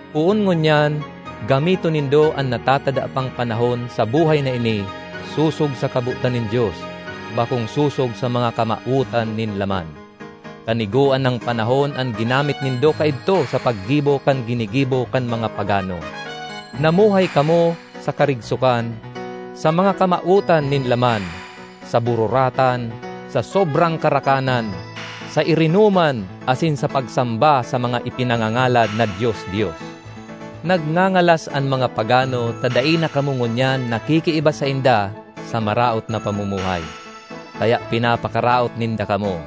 Poon ngunyan gamiton nindo an natatada pang panahon sa buhay na ini sosog sa kabotan nin Dios, bakong sosog sa mga kamawotan nin laman. Kanigoan nang panahon an ginamit nindo kaidto sa paggibo kan ginigibo kan mga pagano. Namuhay kamo sa karigsokan, sa mga kamawotan nin laman, sa bururatan, sa sobrang karakanan, sa irinoman asin sa pagsamba sa mga ipinangangalad na dios-dios. Nagngangalas an mga pagano ta dai na kamo ngunyan nakikiiba sainda sa maraot na pamumuhay, kaya pinapakaraot ninda kamo.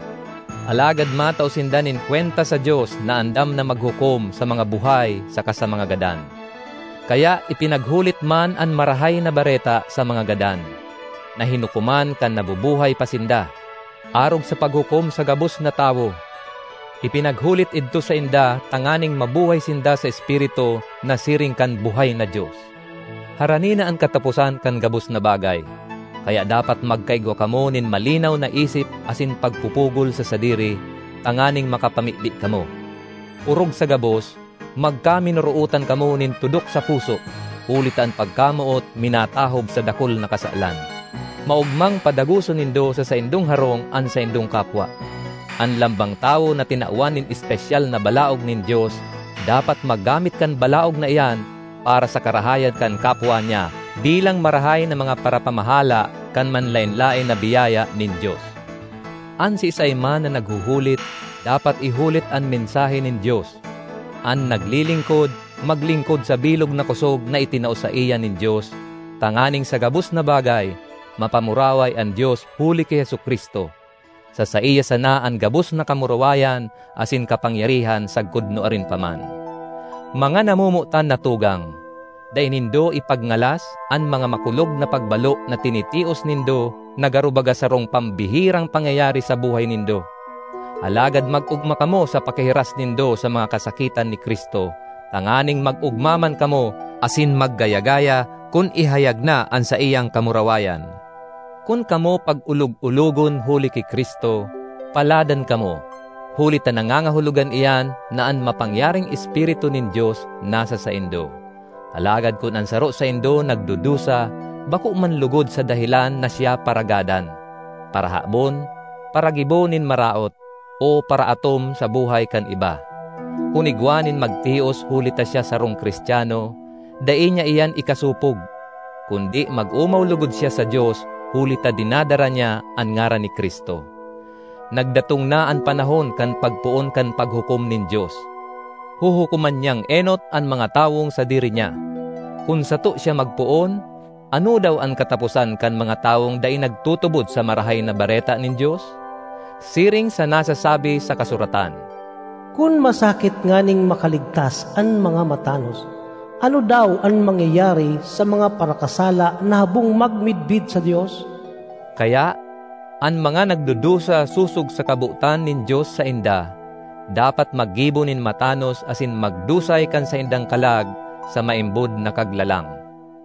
Alagad matao sinda nin kwenta sa Dios na andam na maghukom sa mga buhay saka sa mga gadan. Kaya ipinaghulit man an Marahay na Bareta sa mga gadan, na hinukoman kan nabubuhay pa sinda, arog sa paghukom sa gabos na tawo; ipinaghulit idto sainda tanganing mabuhay sinda sa espiritu na siring kan buhay na Dios. Harani na an kataposan kan gabos na bagay. Kaya dapat magkaigwa kamo nin malinaw na isip asin pagpupugol sa sadiri, tanganing makapamibi kamo. Orog sa gabos, magkaminorootan kamo nin tudok sa puso, huli ta an pagkamoot minatahob sa dakul na kasalan. Maogmang padagoson nindo sa saindong harong an saindong kapwa. An lambang tawo na tinawan nin espesyal na balaog nin Dios dapat maggamit kan balaog na iyan para sa karahayan kan kapwa niya, bilang marahay na mga parapamahala kan manlaen-laen na biyaya nin Dios. An siisay man na naghuhulit, dapat ihulit an mensahe nin Dios; an naglilingkod, maglingkod sa bilog na kosog na itinao saiya nin Dios, tanganing sa gabos na bagay, mapamuraway an Dios huli ki Jesu-Cristo. Sa saiya sana an gabos na kamurawayan asin kapangyarihan sagkod nuarin pa man. Mga namomotan na tugang, dai nindo ipagngalas an mga makulog na pagbalo na tinitios nindo na garo baga sarong pambihirang pangyayari sa buhay nindo. Alagad mag-ogma kamo sa pakihiras nindo sa mga kasakitan ni Cristo, tanganing mag-ogma man kamo asin maggayagaya kun ihayag na an saiyang kamurawayan. Kun kamo pag-olog-ologon huli ki Cristo, paladan kamo, huli ta nangangahulogan iyan na an mapangyaring Espiritu nin Dios nasa saindo. Alagad kun an saro saindo nagdudusa, bako man logod sa dahelan na siya paragadan, parahabon, paragibo nin maraot, o paraatom sa buhay kan iba. Kun igwa nin magtios huli ta siya sarong Cristiano, dai niya iyan ikasopog, kundi mag-omaw logod siya sa Dios huli ta dinadara niya an ngaran ni Cristo. Nagdatong na an panahon kan pagpoon kan Paghukom nin Dios; huhukoman niyang enot an mga tawong sadiri niya. Kun sato siya magpoon, ano daw an kataposan kan mga tawong dai nagtutubod sa Marahay na Bareta nin Dios? Siring sa nasasabi sa kasuratan, “Kun masakit nganing makaligtas an mga matanos, ano daw an mangyayari sa mga parakasala na habong magmidbid sa Dios?” Kaya, an mga nagdudusa sosog sa kabotan nin Dios sainda, dapat maggibo nin matanos asin magdusay kan saindang kalag sa maimbod na Kaglalang.